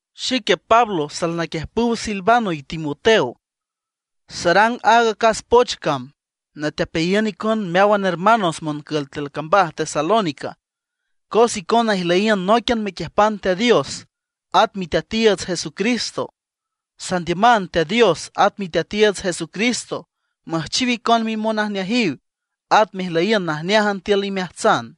Xique Pablo salnaquiüjpüw Silvano y Timoteo, sarang aaga acas poch cam, natepeayiün icon meáwan hermanos moncül tiül cambaj Tesalónica, cos icona ijlüyiün nóiquian mequiüjpan Teat Dios at Miteatiiüts Jesucristo. Sandiüman Teat Dios at Miteatiiüts Jesucristo müjchiw icon mimonajneajiw, at mejlüyiün najneájan tiül imeajtsan.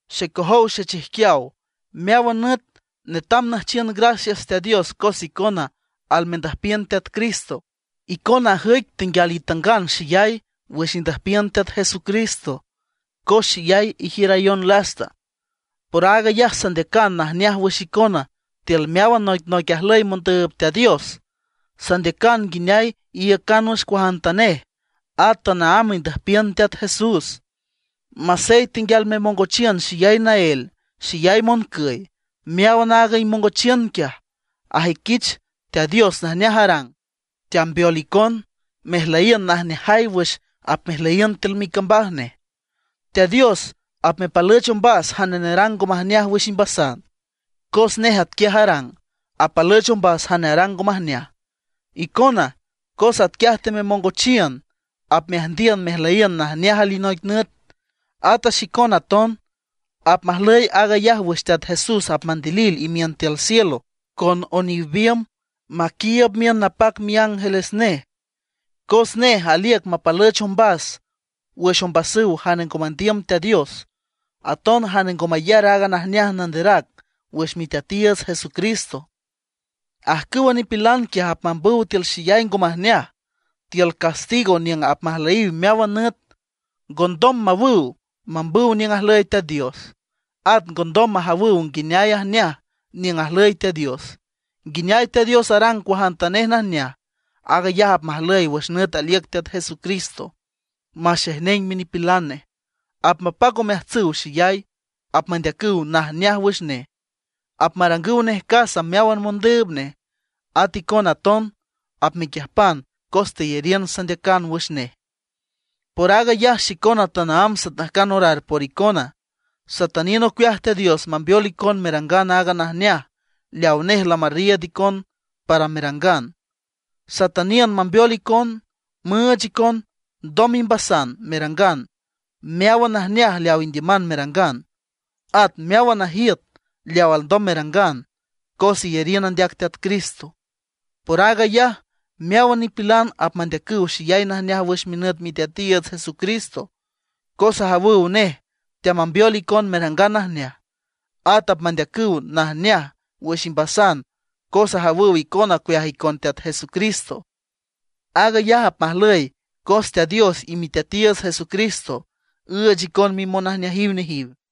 Xecojow xechijquiaw, meáwan nüt netam nüjchiün gracias Teat Dios cos icona almendüjpiün Teat Cristo. Icona ajüic tenguial itangan xeyay wüx indüjpiün Teat Jesucristo cos xeyay ijiürayon lasta. Por aag ayaj sandeacan najneaj wüx icona tiül meáwan noicnoic ajlüy mondüüb Teat Dios. Sandeacan nguineay iiücan wüx cuajantanej, at tanaámb indüjpiün Teat Jesús, masey tenguial memongochiün xeyay naél, xeyay moncüy. Meáwan aaga imongochiün quiaj ajüiquich Teat Dios najneaj arang, teambeol icon, mejlüyiün najneajay wüx apmejmeliün tiül micambaj nej. Teat Dios apmepalüch ombas jane nerang ngo majneaj wüx imbasan, cos nej atquiaj arang, apalüch ombas jane arang ngo majneaj. Icona, cos atquiaj tememongochiün, apmeajndiün mejlüyiün najneaj alinoic nüt, ata xicon aton. Apmajlüy aag ayaj wüx Teat Jesús apmandilil imiün tiül cielo tiül oniw biümb, maquiiüb miün napac miángeles nej. Cos nej aliüc mapalüch ombas wüx ombasüw jane ngo mandiüm Teat Dios, aton jane ngo mayar aaga najneaj nanderac wüx Miteatiiüts Jesucristo. Ajcüwa nipilan quiaj apmambüw tiül xeyay ngo majneaj, tiül castigo niüng apmajlüyiw meáwan nüt, ngondom mawüw mambüw niüng ajlüy Teat Dios; at ngondom majawüw nguineay ajneaj niüng ajlüy Teat Dios, nguineay Teat Dios arang cuajantanej najneaj. Aag ayaj apmajlüy wüx nüt aliüc Teat Jesucristo maxejneng minipilan nej, apmapac omeajtsüw xeyay, apmandeacüw najneaj wüx nej, apmarangüw nej casa meáwan mondüüb nej. At icon aton apmequiüjpan cos teyariün sandeacan wüx nej. Por aag ayaj xicona tanaámb satajcan orar por icona. Satüniün ocueaj Teat Dios mambeol icon merangan aaga najneaj leawa nej lamarriiüd icon para merangan. Satüniün mambeol icon, müüch icon ndoj imbasan merangan meáwan najneaj leaw indiüman merangan, at meáwan najiüt leaw alndom merangan cos iyariün andeac Teat Cristo. Por aag ayaj meáwan nipilan apmandeacüw xeyay najneaj wüx minüt Miteatiiüts Jesucristo, cos ajawüw nej teamambeol icon merangan najneaj. At apmandeacüw najneaj wüx imbasan cos ajawüw icona ocueaj icon Teat Jesucristo. Aag ayaj apmajlüy cos Teat Dios y Miteatiiüts Jesucristo üüch icon mimonajneajiw.